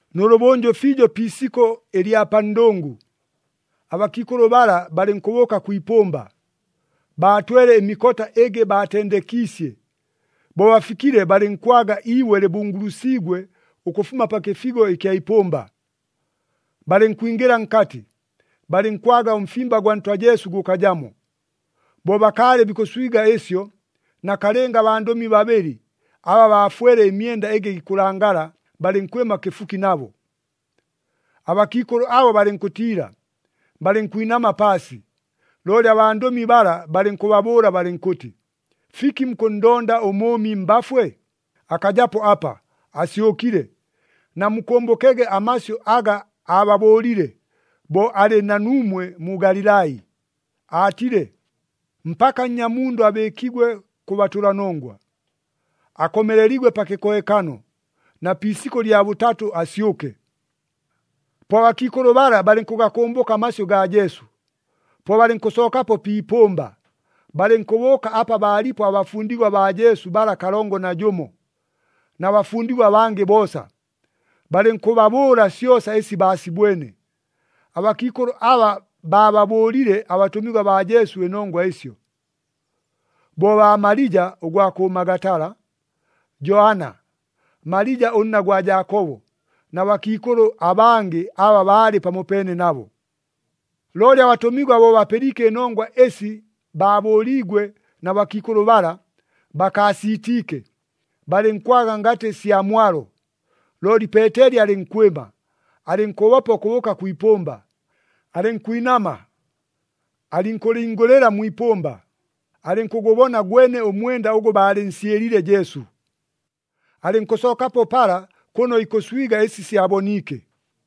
Nʉlʉbʉnjʉ fiijo pi isikʉ ɨlya pa ndʉngʉ, abakiikʉlʉ bala balɨnkʉbʉʉka kwi ipʉmba, baatwele ɨmikota ɨgɨ baatendekiisye. Bo bafikile balɨnkwaga iibwe lɨbungulusiigwe ʉkʉfuma pa kɨfigo ɨkya ipʉmba. Balɨnkwingɨla nkatɨ, balɨnkwaga ʉmfimba gwa Ntwa Jesu gʉkajamo. Bo bakaalɨ bikʉswiga ɨsyo, nakalɨnga abandʉmi babɨlɨ, aba baafwele ɨmyenda ɨgɨ gikʉlangala, balɨnkwɨma kɨfuki nabo. Abakiikʉlʉ abo balɨnkʉtiila, balɨnkwinama paasi. Looli abandʉmi bala balɨnkʉbabʉʉla balɨnkʉtɨ, “Fiki mukʉnndonda ʉmʉʉmi mbafwe? Akajapo apa! Asyʉkile! Namukʉmbʉkege amasyʉ aga aababʉʉlile, bo alɨ na nuumwe mu Galilai, aatile, ‘Mpaka Nnyamundʉ abɨɨkigwe kʉ batʉlanongwa, akomeleligwe pa kɨkohekano, na pi isikʉ lya bʉtatʉ asyʉke!’” Po abakiikʉlʉ bala balɨnkʉgakʉmbʉka amasyʉ gaa Jesu. Po balɨnkʉsookapo pi ipʉmba, balɨnkʉbʉʉka apa baalipo abafundigwa baa Jesu bala kalongo na jʉmo, na bafundigwa abangɨ boosa, balɨnkʉbabʉʉla syosa ɨsi baasibwene. Abakiikʉlʉ aba baababʉʉlile abatʉmigwa baa Jesu ɨnongwa ɨsyo, bo baa Malija ʉgwa kʉ Magatala, Joana, Malija ʉnna gwa Jaakobo, na bakiikʉlʉ abangɨ aba baalɨ pamopeene nabo. Looli abatʉmigwa bo bapɨliike ɨnongwa ɨsi baabʉʉliigwe na bakiikʉlʉ bala, bakaasiitiike, balɨnkwaga ngatɨ sya mwalo. Looli Peeteli alɨnkwɨma, alɨnkʉbopa ʉkʉbʉʉka kwi ipʉmba. Alɨnkwinama, alɨnkʉlingʉlɨla mwi ipʉmba, alɨnkʉgʉbona gwene ʉmwenda ʉgʉ baalɨnsyɨliile Jesu. Alɨnkʉsookapo pala, kʉno ikʉswiga ɨsi syaboniike.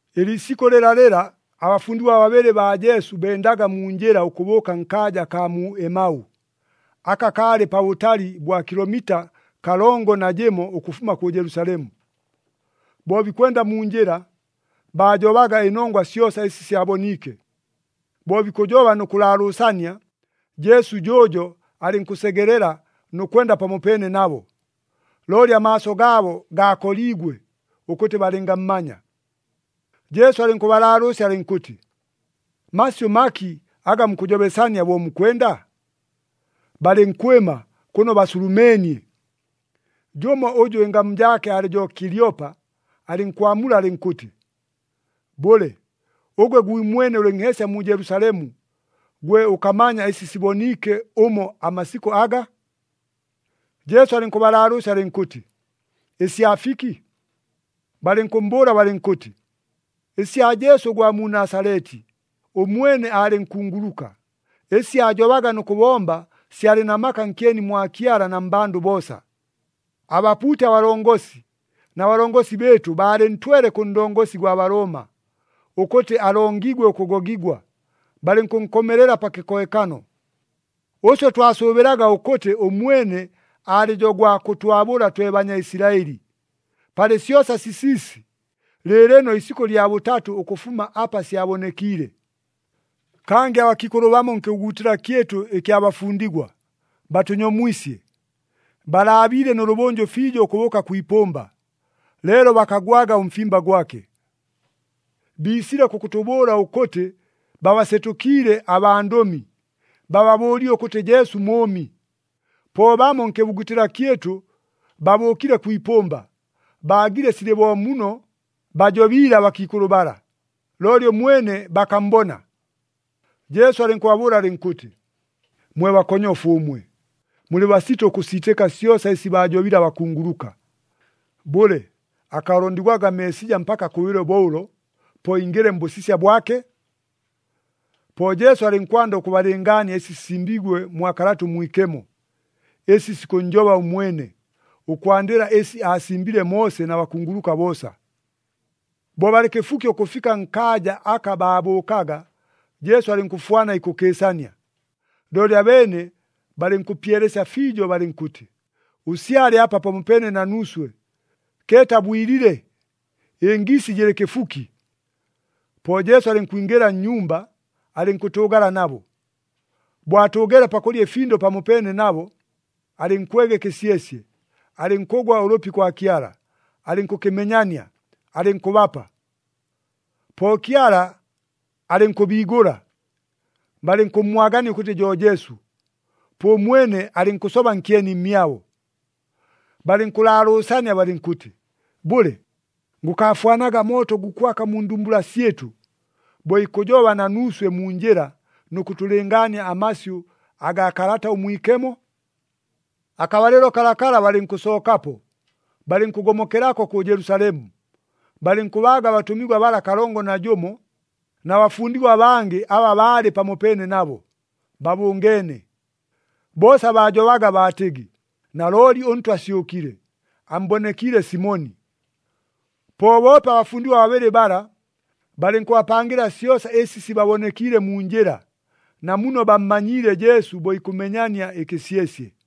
Ɨliisikʉ lɨlalɨla, abafundigwa babɨlɨ baa Jesu bendaga mu njɨla ʉkʉbʉʉka nkaaja akaa mu Emau, aka kaalɨ pabʉtali bwa kilomita kalongo na jɨmo ʉkʉfuma kʉ Jelusalemu. Bo bikwenda mu njɨla, baajobaga ɨnongwa syosa ɨsi syaboniike. Bo bikʉjoba nʉ kʉlaalʉʉsania, Jesu jʉʉjo alɨnkʉsegelela nʉ kwenda pamopeene nabo. Looli amaaso gaabo gaakoliigwe, ʉkʉtɨ balɨngammanya. Jesu alɨnkʉbalaalʉʉsya alɨnkʉtɨ, “Masyʉ maki aga mukʉjobesania bo mukwenda?” Balɨnkwɨma, kʉno baasulumeenie. Jʉmo ʉjʉ ɨngamu jaake aalɨ jo Kilyopa, alɨnkwamula alɨnkʉtɨ, “Bʉle, ʉgwe gwimwene ʉlɨ nheesya mu Jelusalemu, gwe ʉkamanya ɨsi siboniike ʉmo amasikʉ aga?” Jesu alɨnkʉbalaalʉʉsya alɨnkʉtɨ, “Ɨsya fiki?” Balɨnkʉmmbʉʉla balɨnkʉtɨ, “Ɨsya Jesu ʉgwa mu Nasaleti. Ʉmwene aalɨ nkunguluka, ɨsi aajobaga nʉ kʉbomba syalɨ na maka nkyeni mwa Kyala na mmbandʉ boosa. Abapuuti abalongosi na balongosi bɨɨtʉ baalɨntwele kʉ ndongosi gwa Balooma, ʉkʉtɨ alongigwe ʉkʉgogigwa, balɨnkʉnkomelela pa kɨkohekano. Ʉswe twasʉʉbɨlaga ʉkʉtɨ ʉmwene alɨ jo gwa kʉtwabʉla twe Banyaisilaɨli. Palɨ syosa sisiisi, lɨɨlɨno isikʉ lya bʉtatʉ ʉkʉfuma apa syabonekiile. “Kangɨ abakiikʉlʉ bamo nkɨbugutɨla kyɨtʉ ɨkya bafundigwa, batʉnyomwisye. Balaabiile nʉlʉbʉnjʉ fiijo ʉkʉbʉʉka kwi ipʉmba, leelo bakagwaga ʉmfimba gwake. Biisile kʉkʉtʉbʉʉla ʉkʉtɨ babasetʉkiile abandʉmi, bababʉʉlile ʉkʉtɨ Jesu mʉʉmi. Po bamo nkɨbugutɨla kyɨtʉ babʉʉkile kwi ipʉmba, baagile silɨ bo muno bajobiile abakiikʉlʉ bala, looli ʉmwene bakammbona.” Jesu alɨnkʉbabʉʉla alɨnkʉtɨ, “Mwe bakonyofu ʉmwe! Mulɨ basito ʉkʉsiitɨka syosa ɨsi baajobile abakunguluka! Bʉle, akaalondigwaga Meesija mpaka akʉbɨlwe bo ʉlo, po ingɨle mbʉsisya bwake?” Po Jesu alɨnkwanda ʉkʉbalɨngaania ɨsi sisimbiigwe mwa Kalata ʉMwikemo, ɨsi sikʉnnjoba ʉmwene, ʉkwandɨla ɨsi aasimbile Moose na bakunguluka boosa. Bo balɨ kɨfuki ʉkʉfika nkaaja aka baabʉʉkaga, Jesu alɨnkʉfwana ikʉkɨɨsania. Looli abeene balɨnkʉpyelesya fiijo balɨnkʉtɨ, “Ʉsyale apa pamopeene na nuuswe. Keeta bwilile, ɨngiisi jɨlɨ kɨfuki.” Po Jesu alɨnkwingɨla nnyumba, alɨnkʉtʉʉgala nabo. Bo atʉʉgeele pakʉlya ɨfindʉ pamopeene nabo, alɨnkwega ɨkɨsyesye, alɨnkʉgwa ʉlʉpi kwa Kyala, alɨnkʉkɨmenyania, alɨnkʉbapa. Po Kyala alɨnkʉbiigʉla, balɨnkʉmmwagania ʉkʉtɨ jo Jesu, po ʉmwene alɨnkʉsoba nkyeni mmyabo. Balɨnkʉlaalʉʉsania balɨnkʉtɨ, “Bʉle, gʉkaafwanaga mooto gukwaka mu ndumbula syɨtʉ, bo ikʉjoba na nuuswe mu njɨla nʉ kʉtʉlɨngaania amasyʉ agaa Kalata ʉMwikemo?” Akabalɨlo kalakala balɨnkʉsookapo, balɨnkʉgomokelako kʉ Jelusalemu. Balɨnkʉbaaga abatʉmigwa bala kalongo na jʉmo, na bafundigwa abangɨ aba baalɨ pamopeene nabo, babʉngeene. Boosa baajobaga baatɨgɨ, “Nalooli ʉNtwa asyʉkile! Ammbonekiile Simoni!” Po boope abafundigwa babɨlɨ bala, balɨnkʉbapangɨla syosa ɨsi sibabonekiile mu njɨla, na muno bammanyiile Jesu bo ikʉmenyania ɨkɨsyesye.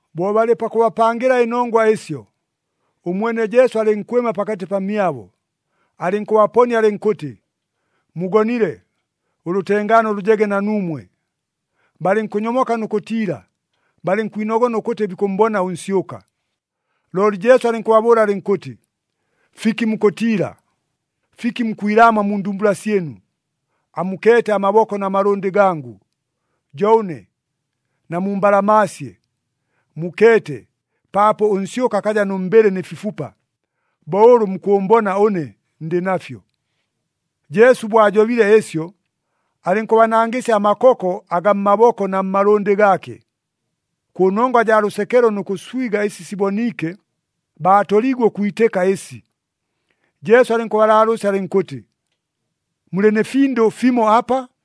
Bo balɨ pakʉbapangɨla ɨnongwa ɨsyo, ʉmwene Jesu alɨnkwɨma pakatɨ pamyabo, alɨnkʉbaponia alɨnkʉtɨ, “Mugonile, ʉlʉtengaano lʉjege na nuumwe!” Balɨnkʉnyomoka nʉ kʉtiila, balɨnkwinogona ʉkʉtɨ bikʉmmbona ʉnsyʉka. Looli Jesu alɨnkʉbabʉʉla alɨnkʉtɨ, “Fiki mukʉtiila? Fiki mukwilaamwa mu ndumbula syɨnu? Amukeete amaboko na malʉndɨ gangʉ, jo ʉne. Namumbalamaasye, mukeete, paapo ʉnsyʉka akaja nʉ mbɨlɨ nɨ fifupa, bo ʉlʉ mukʉʉmbona ʉne ndɨ nafyo.” Jesu bo ajobile ɨsyo, alɨnkʉbanangɨsya amakoko agaa mmaboko na mmalʉndɨ gaake. Kʉnongwa jaa lʉsekelo nʉ kʉswiga ɨsi siboniike, baatoliigwe ʉkwitɨka ɨsi. Jesu alɨnkʉbalaalʉʉsya alɨnkʉtɨ, “Mulɨ nɨ findʉ fimo apa?”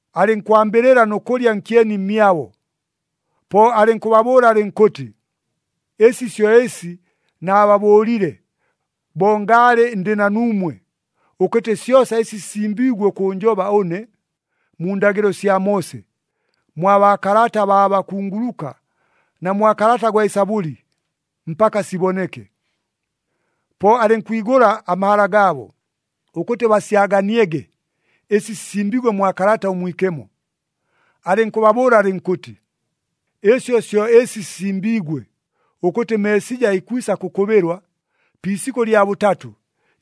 alɨnkwambɨlɨla nʉ kʉlya nkyeni mmyabo. Po alɨnkʉbabʉʉla alɨnkʉtɨ, “Ɨsi syo ɨsi naababʉʉlile, bo ngaalɨ ndɨ na nuumwe, ʉkʉtɨ syosa ɨsi sisimbiigwe ʉkʉʉnjoba ʉne, mu ndagɨlo sya Moose, mwa baakalata baa bakunguluka na mwa kalata gwa Ɨsabʉli, mpaka siboneke.” Po alɨnkwigʉla amahala gaabo, ʉkʉtɨ basyaganiege ɨsi sisimbiigwe mwa Kalata ʉMwikemo. Alɨnkʉbabʉʉla alɨnkʉtɨ, “Ɨsyo syo ɨsi sisimbiigwe, ʉkʉtɨ Meesija ikwisa kʉkʉbɨlwa, pi isikʉ lya bʉtatʉ,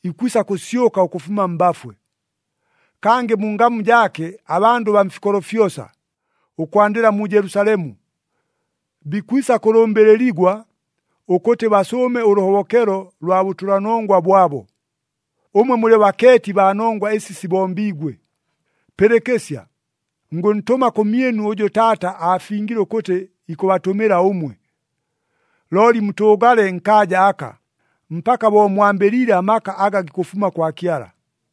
ikwisa kʉsyʉka ʉkʉfuma mbafwe. Kangɨ mu ngamu jaake abandʉ baa mfikolo fyosa, ʉkwandɨla mu Jelusalemu, bikwisa kʉlʉmbɨlɨligwa ʉkʉtɨ basʉʉme ʉlʉhobokelo lwa bʉtʉlanongwa bwabo. Ʉmwe mulɨ bakeeti baa nongwa ɨsi sibombiigwe. “Pɨlɨkɨsya! Ngʉntʉma kʉmyɨnu ʉjʉ Taata aafingile ʉkʉtɨ ikʉbatʉmɨla ʉmwe. Looli mutʉʉgale nkaaja aka, mpaka bo mwambɨliile amaka aga gikʉfuma kwa Kyala.”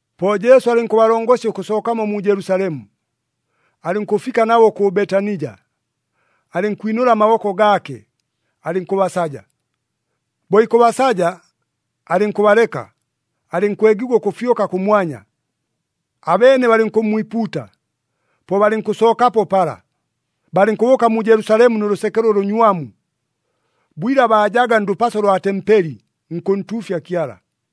Po Jesu alɨnkʉbalongosya ʉkʉsookamo mu Jelusalemu, alɨnkʉfika nabo kʉ Betanija, alɨnkwinʉla amaboko gaake, alɨnkʉbasaja. Bo ikʉbasaja, alɨnkʉbaleka, alɨnkwegigwa ʉkʉfyʉka kʉmwanya. Abeene balɨnkʉmmwipuuta, po balɨnkʉsookapo pala, balɨnkʉbʉʉka mu Jelusalemu nʉ lʉsekelo ʉlʉnywamu. Bwila baajaga ndʉpaso lwa tempeli, nkʉntuufya Kyala.